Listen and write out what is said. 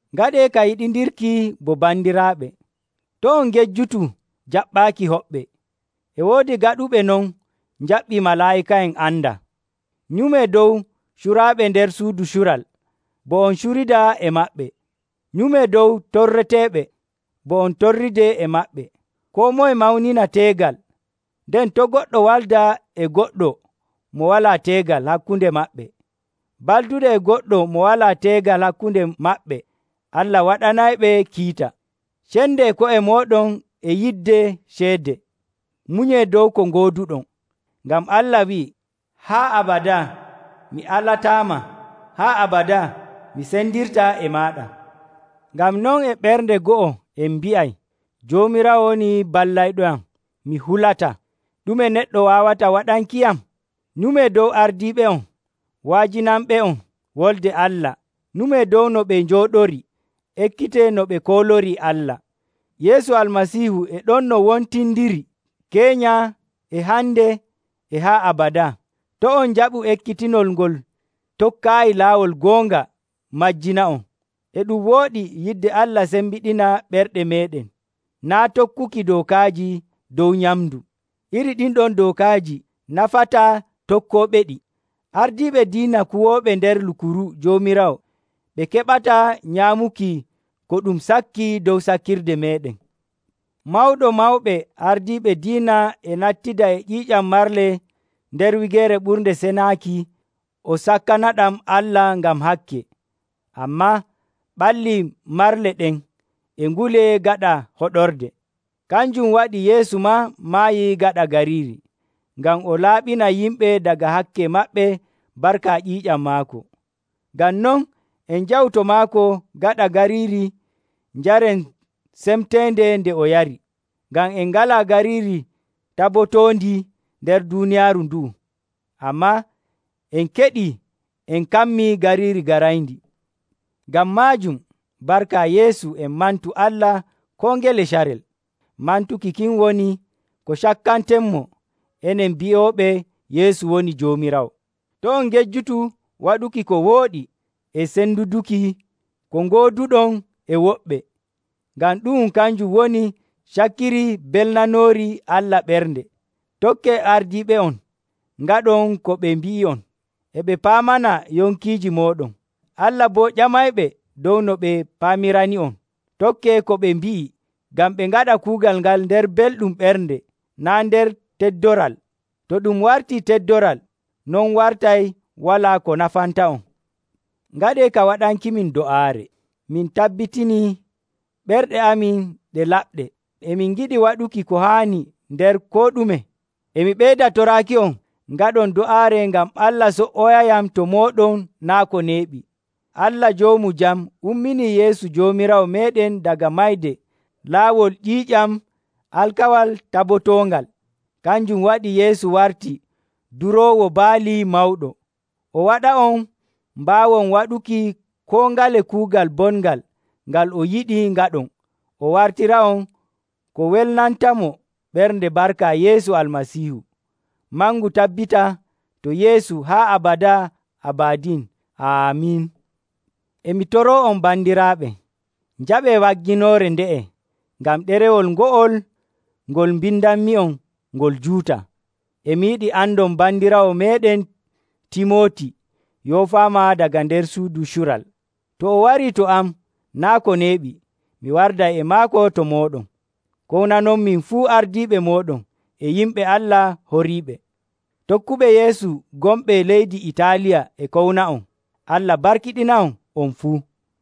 Ngaɗee ka yiɗindirki bo bandiraaɓe. To' on ngejjutu jaɓɓaaki hoɓɓe. E woodi gaɗuɓe non njaɓɓii malaa'ika'en andaa. Nyumee dow curaaɓe nder suudu cural bo on curida e maɓɓe. Nyumee dow torreteeɓe, bo on torridee e maɓɓe. Koo moye mawnina teegal, nden to' goɗɗo walda e goɗɗo mo walaa teegal hakkunde maɓɓe. Balduɗo e goɗɗo mo walaa teegal hakkunde maɓɓe, Allah waɗanayɓe kiita. Cendee ko'e mooɗon e yidde ceede. Munyee dow ko ngooduɗon, ngam Allah wi'ii, “Haa abadaa mi alataama, haa abadaa mi sendirtaa e maaɗa.” Ngam non e ɓernde go'o en mbi'ay, “Joomiraawo woni ballayɗoyam, mi hulataa. Ɗume neɗɗo waawata waɗankiyam?” Nyumee dow ardiiɓe'on, wa'ajinanɓe'on Wolde Allah. Nyumee dow no ɓe njooɗorii, ekkitee no ɓe koolorii Allah. Yeesu Almasiihu e ɗon no wontindiri keenya e hande e haa abadaa. To' on njaɓu ekkitinol ngol tokkaayi laawol goonga majjina'on. E ɗum wooɗi yidde Allah sembiɗina ɓerɗe meeɗen, naa' tokkuki dookaaji dow nyamndu. Iri ɗin ɗon dookaaji nafantaa tokkooɓeɗi. Ardiiɓe diina kuwooɓe nder Lukuru Joomiraawo ɓe keɓataa nyaamuki ko ɗum sakki dow sakkirde meeɗen. Mawɗo mawɓe ardiiɓe diina e nattida e ƴiiƴam marle nder Wigeere Ɓurnde Senaaki o sakkanaɗam Allah ngam hakke, ammaa ɓalli marle ɗen e ngulee gaɗa hoɗorde. Kanjum waɗi Yeesu maa maayi gaɗa gariiri, ngam o laaɓina yimɓe daga hakke maɓɓe barka ƴiiƴam maako. Ngam non en njahu to maako gaɗa gariiri njaren semteende nde o yari. Ngam en ngalaa gariiri tabotoondi nder duuniyaaru ndu'u, ammaa en keɗii en kammii gariiri garayndi. Ngam maajum, barka Yeesu en mantu Allah koo ngele carel. Mantuki kin woni ko cakkantenmo, enen bi'ooɓe Yeesu woni Joomiraawo. To' on ngejjutu waɗuki ko wooɗi e senduduki ko ngooduɗon e woɓɓe, ngam ɗu'um kanjum woni cakkiri belnanoori Allah ɓernde. Tokkee ardiiɓe'on ngaɗon ko ɓe mbi'i'on. E ɓe paamana yonkiiji mooɗon: Allah boo ƴamayɓe dow no ɓe paamirani'on. Tokkee ko ɓe mbi'i ngam ɓe ngaɗa kuugal ngal nder belɗum ɓernde naa' nder teddoral. To ɗum wartii teddoral, non wartay walaa ko nafanta'on. Ngaɗee ka waɗankimin do'aare. Min tabbitinii ɓerɗe amin ɗe laɓɗe, e min ngiɗi waɗuki ko haani nder koo ɗume. E mi ɓeyda toraaki'on ngaɗon do'aare ngam Allah so''oyayam to mooɗon naa' ko neeɓi. Allah Joomu Jam umminii Yeesu Joomiraawo meeɗen daga mayde laawol ƴiiƴam alkawal tabotoongal. Kanjum waɗi Yeesu warti Duroowo Baali Mawɗo, o waɗa'on mbaawon waɗuki koo ngale kuugal bongal ngal o yiɗi ngaɗon. O wartira'on ko welnantamo ɓernde barka Yeesu Almasiihu. Mangu tabbita to Yeesu haa abadaa abadin. Aamin. E mi toroo'on bandiraaɓe, njaɓee wagginoore nde'e, ngam ɗerewol ngo'ol ngol mbindanmi'on ngol juutaa. E mi yiɗi andon bandiraawo meeɗen Timooti yoofaama daga nder suudu cural. To o warii to am naa' ko neeɓi, mi warday e maako to mooɗon. Kownanonmin fuu ardiiɓe mooɗon e yimɓe Allah horiiɓe. Tokkuɓe Yeesu gonɓe leydi Itaaliya e kowna'on. Allah barkiɗina'on, on fuu.